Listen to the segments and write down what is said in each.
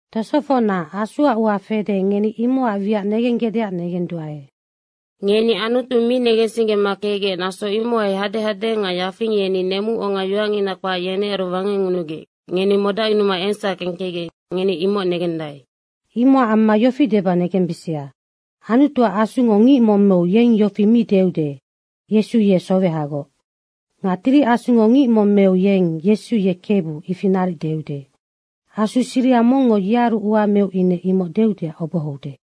Tosofocna, Asuac ua fede, ngeni imocac wiac negenggecdeac negenduae. Ngeni Anutu mi negensinggema kecgec, naso imohai hadehade nga yafing yeni nemuonga yoacngina kpac, yenearu wangecngunugec ngeni modacyunuma engsac kengkecgec, ngeni imoc negendae. Imocac amma yofi deba negembisia, Anutuac Asungo ngic mong meu yeng yofi mong mi deude, “Yesu ye sowehagoc.” Nga Tiri Asungo ngic mong meu yeng, “Yesu ye Kebu.” ifi naric deude. Asu siriha mongngo yearu ua meu ine imoc deudeac obohoude.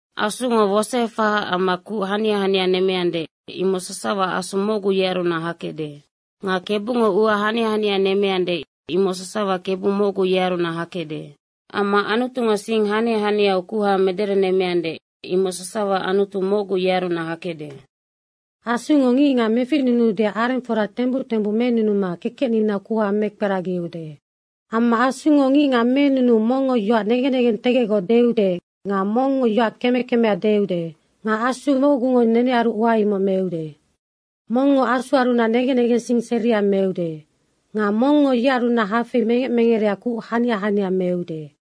Asungo wosoefahaac amma kuc hania hania nemmeande, imoc sasawa Asu mocgu, yearunac hakecde. Nga Kebungo ua hania hania nemmeande, imoc sasawa Kebu mocgu, yearunac hakecde. Amma Anutungo sing hania haniau kuha mederenemmeande, imoc sasawa Anutu mocgu, yearunac hakecde. Asungo ngicngac meficnunuudeac arengfora tembuc tembuc menunuma kekecninau kuha mekperagiude. Amma Asungo ngicngac menunuu mongngo yoac negen negentegecgoc deude nga mongngo yoac keme kemea deude. Nga Asu mocgungo nenearu ua imoc meude. Mongngo Asuarunac negen negensing seria meude. Nga mongngo yearunac hafei mengec mengereac kuc hania hania meude.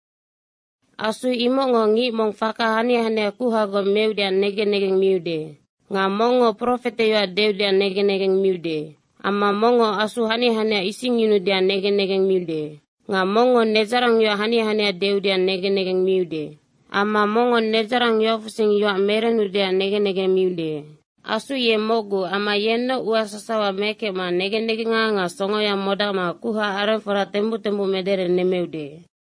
Asu imocngoc ngic mong faka hania hania kuhagoc meudeac negen negeng miude. Nga mongngo profete yoac deudeac negen negeng miude. Amma mongngo asu hania hania isingyunuudeac negen negeng miude. Nga mongngo nedzarangyoac hania hania deudeac negen negeng miude. Amma mongngo nedzarang yoacfusing yoac merenudeac negen negeng miude. Asu ye mocgu amma yennoc ua sasawa mekecma negen negenga nga songoya modacma kuha arengfora tembuc tembuc mederenemmeude.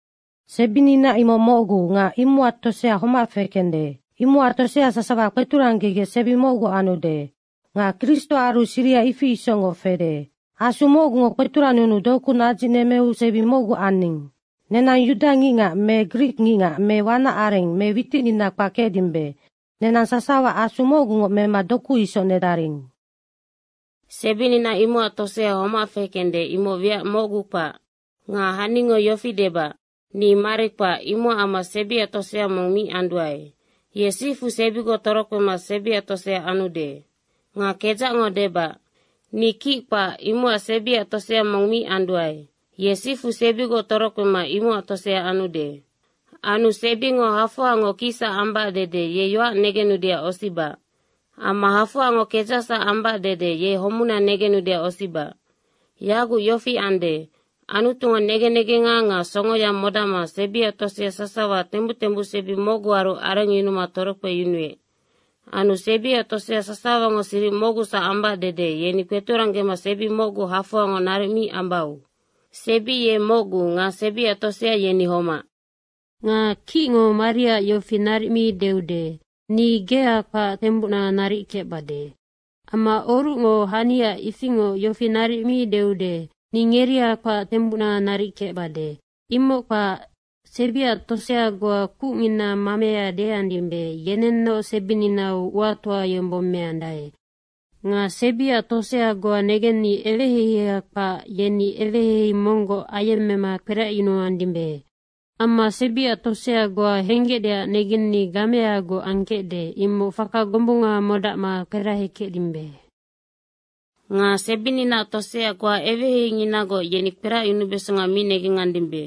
Sebinina imoc mocgu nga imocac tosea homac fekende. Imocac tosea sasawa kpeturanggegec sebi mocgu anude. Nga Kristoaru siriha ifi isocngoc fede. Asu mocgungo kpeturannunuma doku nadzicnemmeu sebi mocgu aning. Nenang yuda ngicngac me grik ngicngac me wanac areng me witicnina kpac kecdimbe, nenang sasawa Asu mocgungoc mema doku isoc nedaring. Sebinina imocac tosea homac fekende, imoc wiac mocgu kpac. Nga haningo yofi debac, “Ni mari kpac, imocac amma sebiac tosea mong mi anduae.” ye sifu sebigoc torokpema sebiac tosea anude. Nga kedzacngo debac, “Ni kic kpac, imocac sebiac tosea mong mi anduae.” ye sifu sebigoc torokpema imocac tosea anude. Anu sebingo hafoangoc kicsac ambac dede ye yoac negenudeac osibac. Me hafoangoc kedzacsac ambac dede ye homuna negenudeac osibac. Yaguc yofi ande, Anutungo negen negenga nga songoya modacma sebiac tosea sasawa tembuc tembuc sebi mocguaru arengyunuma torokpeyunuec. Anu sebiac tosea sasawango siric mocgusac ambac dede yeni kpeturanggema sebi mocgu hafoangoc naric mi ambau. Sebi ye mocgu nga sebiac tosea yeni homac. Nga kicngo mariaac yofi naric mi deude, “Ni gea kpac tembuc naric kecbade.” Amma orucngo haniac ifingoc yofi naric mi deude, “Ni ngeria kpac tembuc naric kecbade.” Imoc kpac, sebiac tosea goa kucngina mamea deandimbe, yenennoc sebininau uatoa yombong meandae. Nga sebiac tosea goa negenni eweheiheia kpac, yeni eweheihei monggoc ayemmema kperacyunuandimbe. Amma sebiac tosea goa henggecdeac negenni gameagoc angkecde, imoc faka gombunga modacma kperahekecdimbe. Nga sebininaac tosea goa eweheiheinginagoc, yeni kperacyunubesonga mi negengandimbe.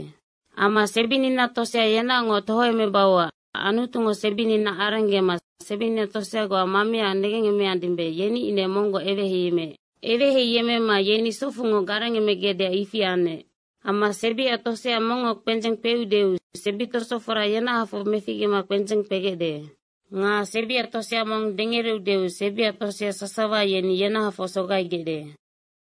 Amma sebinina tosea yenaocngoc tohoemebauac Anutungo sebinina arenggema sebinina tosea goa mamea negengandimbe, yeni ine monggoc eweheiyemmeec. Eweheiyemmema yeni socfungoc garengemegecdeac ifi anec. Amma sebiac tosea mongngo kpendzeng kpeudeu sebitosofora yenahafocngoc meficgema kpendzeng kpegecde. Nga sebiac tosea mong dengereudeu sebiac tosea sasawa yeni yenahafocngoc sogaigecde.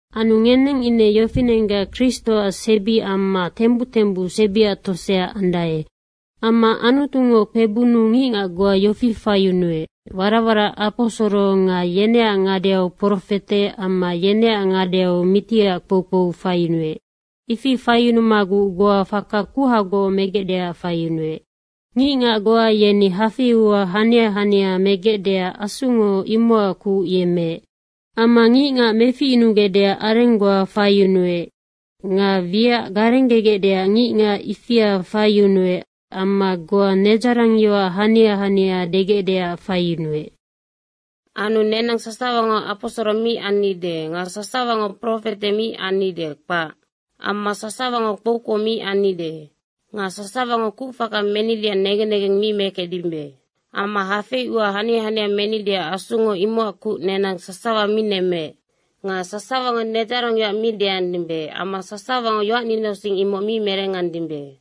Anu ngeneng ine yofinenggac Kristoac sebi amma tembuc tembuc sebiaac tosea andae. Amma Anutungo kpebunnu ngicngac goa yofi faiyunuec, warac warac aposoro nga yeneac ngadeau profete amma yeneac ngadeu mitiac kpoukpou faiyunuec. Ifi faiyunumaguc goa faka kuhagoc megecdeac faiyunuec. Ngicngac goa yeni hafei ua hania hania megecdeac Asungo imocac kuc yemmeec. Amma ngicngac meficyunugecdeac areng goa faiyunuec nga wiac garenggegecdeac ngicngac ifia faiyunuec amma goa nedzarangyoac hania hania degecdeac faiyunuec. Anu nenang sasawango aposoro mi annide nga sasawango profete mi annide, kpac. Amma sasawango kpoukpou mi annide. Nga sasawango kucfaka menideac negen negeng mi mekecdimbe. Amma hafei ua hania hania menideac Asungo imocac kuc nenang sasawa mi nemmeec. Nga sasawango nedzarangyoac mi deandimbe amma sasawango yoacninausing imoc mi merengandimbe.